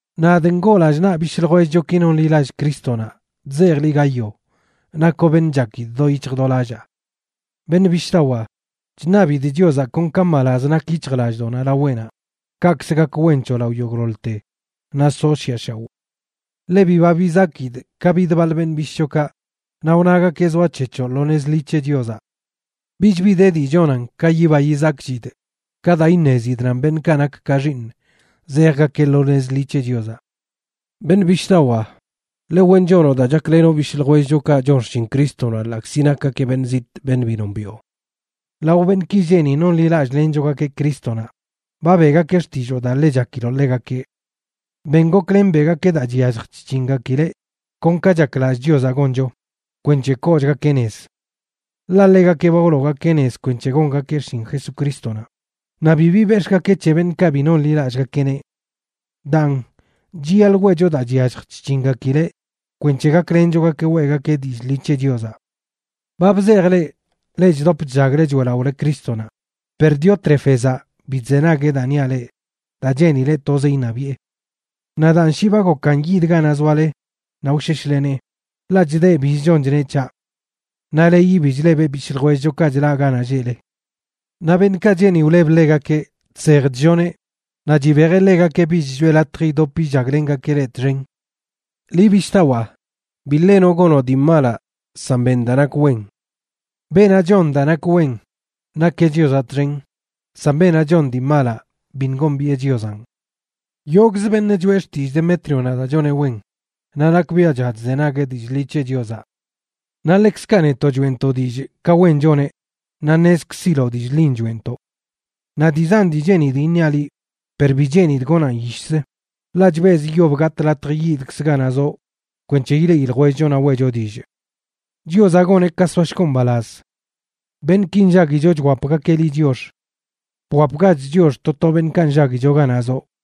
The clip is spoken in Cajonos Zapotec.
Nadꞌ ngoo lallꞌ naꞌ bishꞌ ljwellchoki nonḻilallꞌ Crístonaꞌ, chzejꞌ liꞌ, Gayo, nakoꞌ beṉꞌ chakidꞌ do yic̱hj do lallaa. Beṉꞌ bishꞌdawaa, chṉabidꞌ Chiozaꞌ kon ka mbalaz nak yic̱hjlallꞌdoꞌnaꞌ laweꞌnaꞌ, kaꞌkz gak wen c̱hoꞌ lao yogꞌḻoḻte naꞌ soꞌ shiꞌa shaoꞌ. Ḻe biba bizakidꞌ ka bid baḻ beṉꞌ bishꞌchokaꞌ naꞌ wnagakeꞌ zoac̱hec̱hoꞌ lo nez ḻi c̱he Chiozaꞌ. Bich bi de dii chonan ka yiba yizakchidꞌ ka daa iṉezidꞌ nan beṉꞌkaꞌ nak ka xiiṉꞌ zejgakeꞌ lo nez ḻi c̱he Chiozaꞌ. Beṉꞌ bishꞌdawaa, ḻe wen chonoꞌ daa chaklenoꞌ bishꞌ ljwellchokaꞌ chon xshin Crístonaꞌ, ḻaꞌkzi nakgakeꞌ beṉꞌ zitꞌ beṉꞌ bi nombiꞌo. Lao beṉꞌki lleꞌ ni nonḻilallꞌlenchogakeꞌ Crístonaꞌ ba beꞌgakeꞌ xtilloo daa ḻe chakiloꞌ ḻegakeꞌ. Ben goklen, beꞌgakeꞌ daa chyallj chc̱hingakileꞌ kon ka chaklallꞌ Chiozaꞌ goncho, kwenc̱he koochgakeꞌ nez. Ḻaꞌ ḻegakeꞌ ba wloogakeꞌ nez kwenc̱he gongakeꞌ xshin Jesucrístonaꞌ, naꞌ bibi bex̱ꞌgakeꞌ c̱he beṉꞌkaꞌ bi nonḻilallꞌgakeꞌneꞌ. Daan, chiyaḻꞌ weꞌcho daa chyallj chc̱hingakileꞌ kwenc̱he gaklenchogakeꞌ weꞌgakeꞌ dillꞌ ḻi c̱he Chiozaꞌ. Ba bzejꞌ leꞌ, leꞌ chdop chllagle choeꞌlaꞌole Crístonaꞌ, per Diótrefezaꞌ bi chzenagueꞌ daa niaꞌ leꞌ daa cheenileꞌ tozeꞌ iṉabiꞌe. Naꞌ daan shi ba gokan yidꞌ ganaꞌ zoale naꞌ wsheshlenee, ḻaꞌ chdeꞌ biz chon chneꞌ c̱haꞌ. Naꞌ leyi bi chlebeꞌ bishꞌ ljwellchokaꞌ chlaꞌ ganaꞌ lleꞌle. Naꞌ beṉꞌkaꞌ cheeni wleb ḻegakeꞌ, chsej chlloneꞌ, naꞌ chibejeꞌ ḻegakeꞌ bich choꞌe latj idop illaglengakeꞌ leꞌ txen. Liꞌ bishꞌdawaa, bi ḻenoꞌ gonoꞌ dii malaꞌ, san ben daa nak wen. Beenaꞌ chon daa nak wen nakeꞌ Chiozaꞌ txen, san beenaꞌ chon dii malaꞌ biṉꞌ gombiꞌe Chiozanꞌ. Yogꞌzə beṉꞌ choeꞌ xtillꞌ Demétrionaꞌ daa choneꞌ wen, naꞌ nakbiaꞌcha chzenagueꞌ dillꞌ ḻi c̱he Chiozaꞌ. Naꞌ ḻekzkaꞌ netoꞌ choeꞌntoꞌ dillꞌ ka wen choneꞌ, naꞌ ṉezkziloꞌ dillꞌ ḻin choeꞌntoꞌ. Naꞌ dii zan dii cheenidꞌ iṉiaꞌ liꞌ, per bi cheenidꞌ gonaꞌn yishzə, ḻaꞌ chbezꞌ yob gatꞌ latj yidkzꞌ ganaꞌ zoꞌ kwenc̱he ileꞌi ljwellcho naꞌ weꞌcho dillꞌ. Chiozaꞌ goneꞌ ka soashgoꞌ mbalaz. Beṉꞌki nllaguicho chwapgakeꞌ liꞌ chiox. Bwapgach chiox to to beṉꞌkaꞌ nllaguicho ganaꞌ zoꞌ.